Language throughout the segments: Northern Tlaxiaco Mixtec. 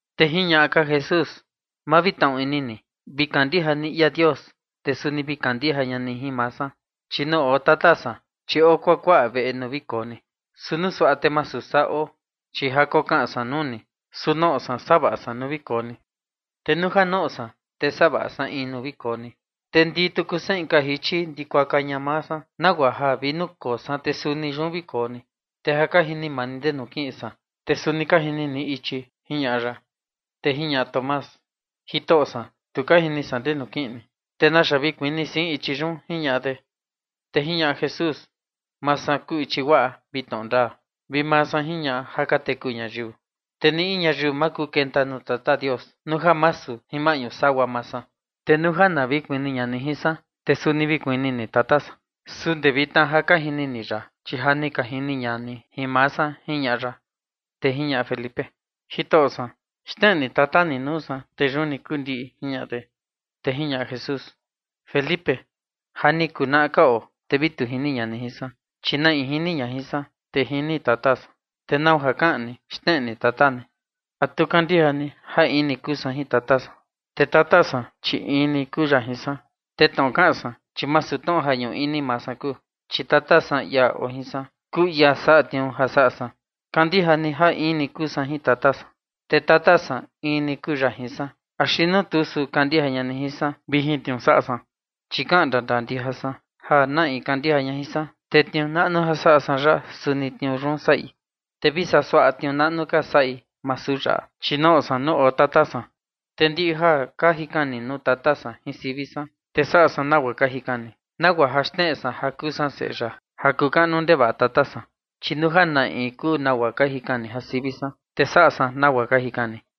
Te jiñaꞌa ka Jesús: ―Ma vi tnaꞌu ini ni, vi kandija ni ia Dios, te suni vi kandija ña ni jin maa san. Chi nuu oo Tata san, chi oo kuakuaꞌa veꞌe nuu vi koo ni. Su nuu suaꞌa te masu saa oo, chi ja kokaꞌan san nuu ni. Su noꞌo san savaꞌa san nuu vi koo ni. Te nuu ja noꞌo san, te savaꞌa san in nuu vi koo ni, te ndii tuku san inka jichi, ndikuaka ña maa san, nagua ja vi nuu koo san, te suni yun vi koo ni. Te ja ka jini maa ni ndenu kiꞌin san, te suni ka jini ni ichi ―jiñaꞌa ya. Te jiñaꞌa Tomás: ―Jitoꞌo san, tu ka jini san ndenu kiꞌin ni, ¿te naxa vi kuni sein ichi yun? ―jiñaꞌa de. Te jiñaꞌa Jesús: ―Maa san kuu ichi guaꞌa vi tnoꞌo ndaa, vi maa san jiñaꞌa ja ka teku ñayiu. Te ni in ñayiu ma kuu kenta nuu Tata Dios nuu ja masu jin maꞌñu sagua maa san. Te nuu ja na vi kuni ña ni jin san, te suni vi kuni ni Tata san. Su ndee vitna ja ka jini ni ya, chi ja ni ka jini ña ni jin maa san ―jiñaꞌa ya. Te jiñaꞌa Felipe: ―Jitoꞌo san, xneꞌe ni tata ni nuu saa, te yun ni kuu ndiꞌi ―jiñaꞌa de. Te jiñaꞌa Jesús: ―Felipe, ja ni kunaꞌa ka oo, ¿te a vi tu jini ña ni jin san? Chi na in jini ña jin san, te jini Tata san. ¿Te nau ja kaꞌan ni: “Xneꞌe ni Tata ni”? ¿A tu kandija ni ja in ni kuu san jin Tata san, te Tata san in ni kuu ya jin san? Te tnoꞌo ja kaꞌan san, chi masu tnoꞌo ja ñuꞌu ini maa san kuu, chi Tata san, ia oo jin san, kuu ia saꞌa tniuu ja saꞌa san. Kandija ni ja in ni kuu san jin Tata san, te Tata san in ni kuu ya jin san, axi nuu tuu, su kandija ña ni jin san vi jin tniuu saꞌa san. Chi kaꞌan ndandaa ndija san ja na in kandija ña jin san, te tniuu naꞌnu ja saꞌa san yaꞌa suni tniuu yun saꞌi, te vi suaꞌa tniuu naꞌnu ka saꞌi, masu yaꞌa, chi noꞌo san nuu oo Tata san. Te ndiꞌi ja ka jikan ni nuu Tata san jin sivi san, te saꞌa san nagua ka jikan ni, nagua ja xneꞌe san ja kuu san Seꞌe ya ja kuu kaꞌnu ndevaꞌa Tata san. Chi nuu ja na in guaa kuu ja ka jikan ni jin sivi san, te saꞌa san nagua ka jikan ni.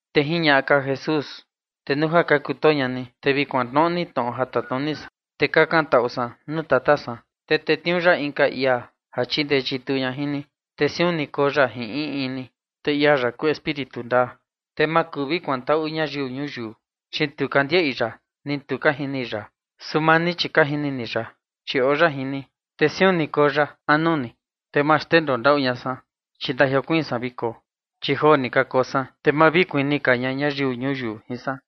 Te jiñaꞌa ka Jesús: ―Te nuu ja ka kutoo ña ni, te vi kuantnoꞌo ni tnoꞌo ja tatnuni san. Te kakan taꞌu san nuu Tata san, te tetniuu ya inka ia chindee chituu ña jin ni, te siun ni koo ya jin in in ni. Te ia yaꞌa kuu Espíritu ndaa, te ma kuu vi kuantaꞌu ñayiu ñuyiu, chi tu ka ndiaꞌi ya, ni tu ka jini ya. Su maa ni, chi ka jini ni ya, chi oo ya jin ni, te siun ni koo ya ini anu ni. Te ma xndendoo ndaꞌu ña san, chi ndajiokuiin san vi koo. Chi joo ni ka koo san, te ma vi kuni ka ña ñayiu ñuyiu jin san.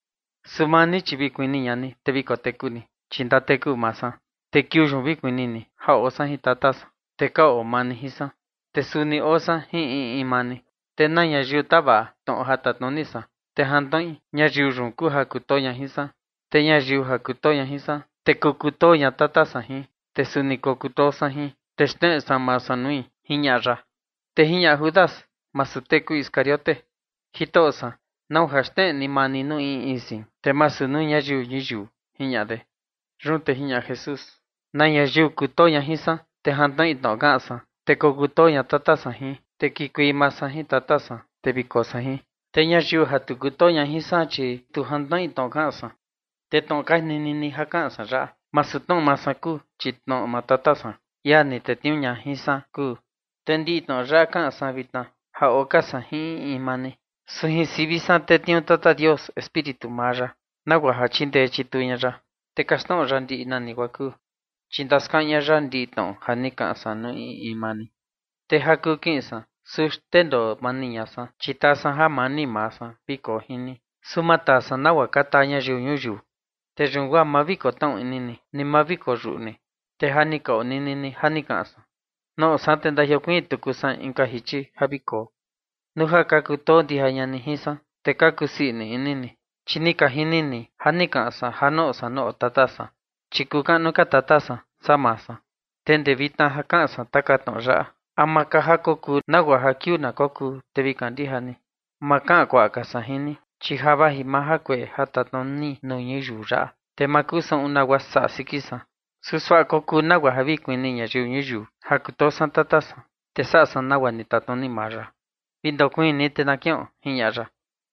Su maa ni, chi vi kuni ña ni, te vi koteku ni, chi ndateku maa san. Te kiuu yun vi kuni ni ja oo san jin Tata san, te ka oo maa ni jin san, te suni oo san jin in in maa ni. Te na ñayiu tavaꞌa tnoꞌo ja tatnuni san, te jantnoꞌi, ñayiu yun kuu ja kutoo ña jin san, te ñayiu ja kutoo ña jin san, te kokutoo ña Tata san jin, te suni kokutoo san jin, te xneꞌe san maa san nui ―jiñaꞌa ya. Te jiñaꞌa Judas, masu tee kuu Iscariote: ―Jitoꞌo san, ¿nau ja xneꞌe ni maa ni nuu in in sein, te masu nuu ñayiu ñuyiu? ―jiñaꞌa de. Yun te jiñaꞌa Jesús: ―Na ñayiu kutoo ña jin san, te jantnoꞌi tnoꞌo kaꞌan san, te kokutoo ña Tata san jin, te kikuei maa san jin Tata san, te vi koo san jin. Te ñayiu ja tu kutoo ña jin san, chi tu jantnoꞌi tnoꞌo kaꞌan san. Te tnoꞌo ka nini ni ja kaꞌan san yaꞌa, masu tnoꞌo maa san kuu, chi tnoꞌo maa Tata san, ia ni tetniuu ña jin san kuu. Te ndiꞌi tnoꞌo yaꞌa kaꞌan san vitna ja oo ka san jin in in maa ni. Su jin sivi san tetniuu Tata Dios Espíritu maa ya, nagua ja chindee chituu ña ya, te kaxtnoꞌo ya ndiꞌi nani guaa kuu, chi ndaskaꞌan ña ya ndiꞌi tnoꞌo ja ni kaꞌan san nuu in in maa ni. Te ja kuu kiꞌin san, su xndendoo mani ña san, chi taa san jamani maa san vi koo jin ni, su maa taa san nagua ka taa ñayiu ñuyiu. Te yun guaa ma vi kotnaꞌu ini ni, ni ma vi koyuꞌu ni. Te ja ni ka onini ni, ja ni kaꞌan san: “Noꞌo san, te ndajiokuiin tuku san inka jichi ja vi koo”. Nuu ja ka kutoo ndija ña ni jin san, te ka kusii ini ni, chi ni ka jini ni ni kaꞌan san ja noꞌo san nuu oo Tata san, chi kuu kaꞌnu ka Tata san saa maa san. Te ndee vitna ja kaꞌan san taka tnoꞌo yaꞌa, ama ka ja kokuu, nagua ja kiuu na kokuu, te vi kandija ni. Ma kaꞌan kuaꞌa ka san jin ni, chi ja vaji maa jakueꞌe ja tatnuni nuu ñuyiu yaꞌa, te ma kuu saꞌun nagua saꞌa siki san. Su suaꞌa kokuu nagua ja vi kuni ñayiu ñuyiu ja kutoo san Tata san, te saꞌa san nagua ni tatnuni maa ya. ’Vi ndakoo ni, te na kiꞌon ―jiñaꞌa ya.